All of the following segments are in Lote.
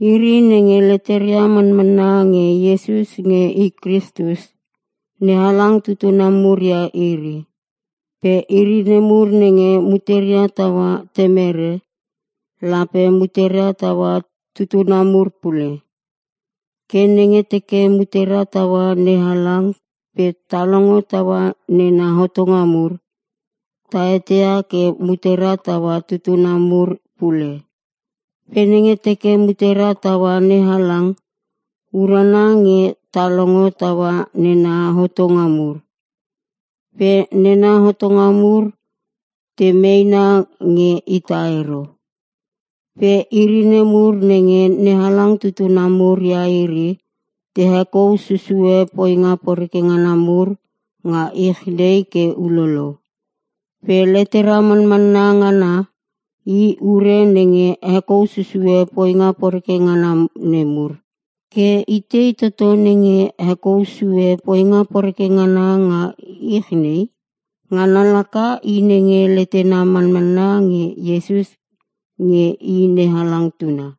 Iri nenge leteria manmanna nge Iesus nge I Kristus, NeHalang tutuna mur ia iri. Pe iri nemur nenge muteria taua temere, lape muteria taua tutuna mur pule. Ke nenge teke mutera taua NeHalang pe ta longo taua nena hotonga mur, ta eteia ke mutera taua tutuna mur pule. Pe nenge teke mutera taua NeHalang, urana nge ta longo taua nena hotonga mur. Pe nena hotonga mur te meena nge ita ero. Pe iri nemur nenge NeHalang tutuna mur ia iri te hekou susue poinga poreke ngana mur nga ich nei ke ulolo. Pe letera manmanna ngana, i ure nenge hekou susue poinga poreke ngana nemur. Ke itei toto nenge hekou sue poinga poreke ngana nga ich nei? Ngana laka i nenge letena manmanna nge Iesus nge I NeHalang Tuna.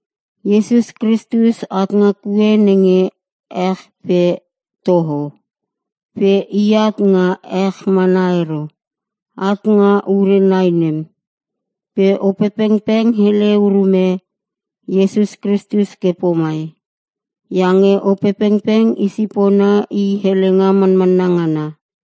Iesus Kristus at nga kue nenge ech pe toho. Pe I at nga ech mana ero. At nga ure nai nem. Pe Opepengpeng hele urume Iesus Kristus ke pomai, iange Opepengpeng I sipona I helenga manmanna ngana.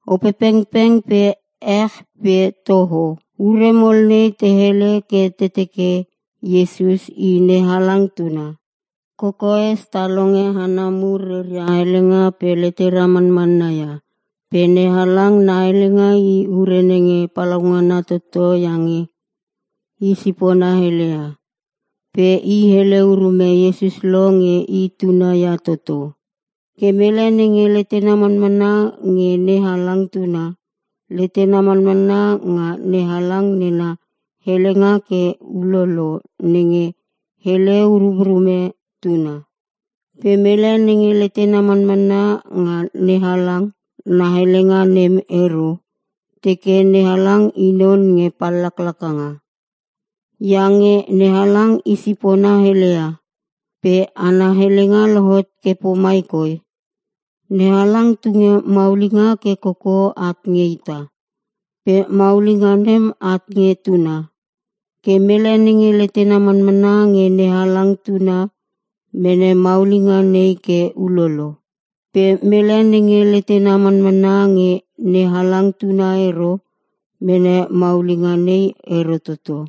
Opepengpeng pe ech pe toho. Ure mol nei te hele ke te teke Iesus I NeHalang Tuna. Kokoes ta longe hana mur reria helenga pe letera manmanna ia. Pe NeHalang na helenga i ure nenge palaungana toto iange i sipona heleia. Pe I hele urume Iesus lo nge I Tuna ia toto. Ke mele nenge letena manmanna nge NeHalang Tuna, letena manmanna nga NeHalang nena helenga ke ulolo nenge hele urumrume Tuna. Pe mele nenge letena manmanna nga NeHalang na helenga nem ero, teke NeHalang I non nge pallaklaka. Iange NeHalang i sipona heleia. Pe ana helenga lohot ke pomai koi: NeHalang tunge maulinga ke koko at nge ita. Pe maulinga nem at nge Tuna. Ke mele nenge letena manmanna nge NeHalang Tuna mene maulinga nei ke ulolo. Pe mele nenge letena manmanna nge NeHalang Tuna ero mene maulinga nei ero toto.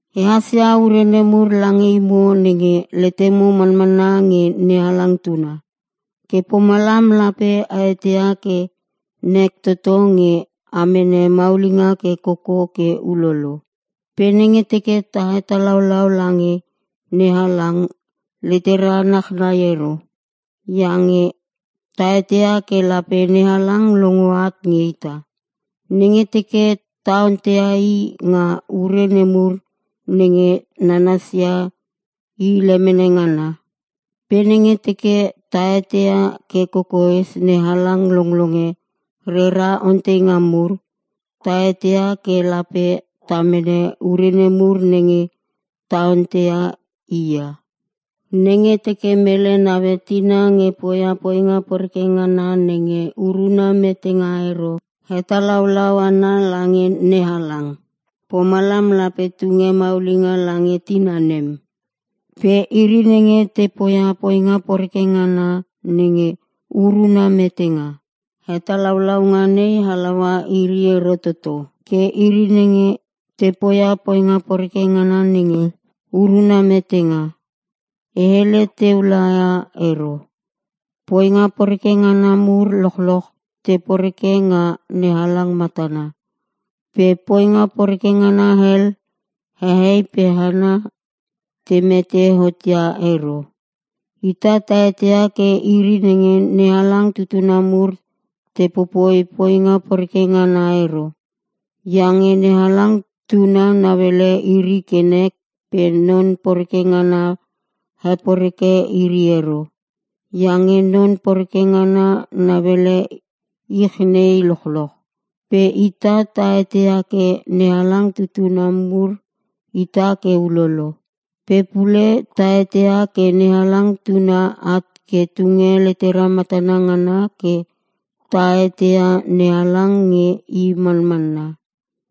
E hasia ure nemur lange imo nenge letemo manmanna nge NeHalang Tuna. Ke pomalam lape a eteia ke nek toto nge a mene maulinga ke koko ke ulolo. Pe nenge teke ta hetalaulau lange NeHalang letera nachnai ero. Iange ta eteia ke lape NeHalang longo at nge ita, nenge teke ta onteia I nga ure nemur nenge nanasia I lemene ngana. Pe nenge teke ta eteia ke kokoes NeHalang longlonge rera onteinga mur, ta eteia ke lape ta mene ure nemur nenge ta ontei I ia. Nenge teke mele naue tina nge poia poinga poreke ngana nenge uruna metenga ero, hetalaulau ana lange NeHalang. Pomalam lape tunge maulinga lange tina nem. Pe iri nenge te poia poinga poreke ngana nenge uruna metenga, hetalaulaunga nei halaua iri ero toto. Ke iri nenge te poia poinga poreke ngana nenge uruna metenga, e hele teu laia ero. Poinga poreke ngana mur lochloch te poreke nga NeHalang matana. Pe poinga poreke ngana hel, hehei pe hana te mete hotia ero. Ita ta eteia ke iri nenge NeHalang tutuna mur te popoi poinga poreke ngana ero. Iange NeHalang Tuna nauele iri ke nek pe non poreke ngana heporeke iri ero. Iange non poreke ngana nauele ich nei lochloch. Pe ita ta eteia ke NeHalang tutuna mur ita ke ulolo. Pe pule ta eteia ke NeHalang Tuna at ke tunge letera matana ngana ke ta eteia NeHalang nge I manmanna.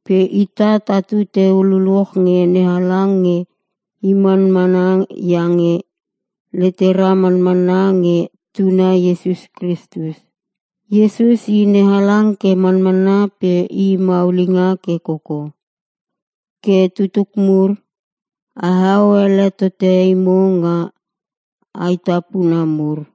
Pe ita tatu teu luluch nge NeHalang nge I manmanna iange letera manmanna nge Tuna Iesus Kristus. Iesus I NeHalang ke manmanna pe I maulinga ke koko. Ke tutuk mur, aheo ele tote imo nga aetapuna mur.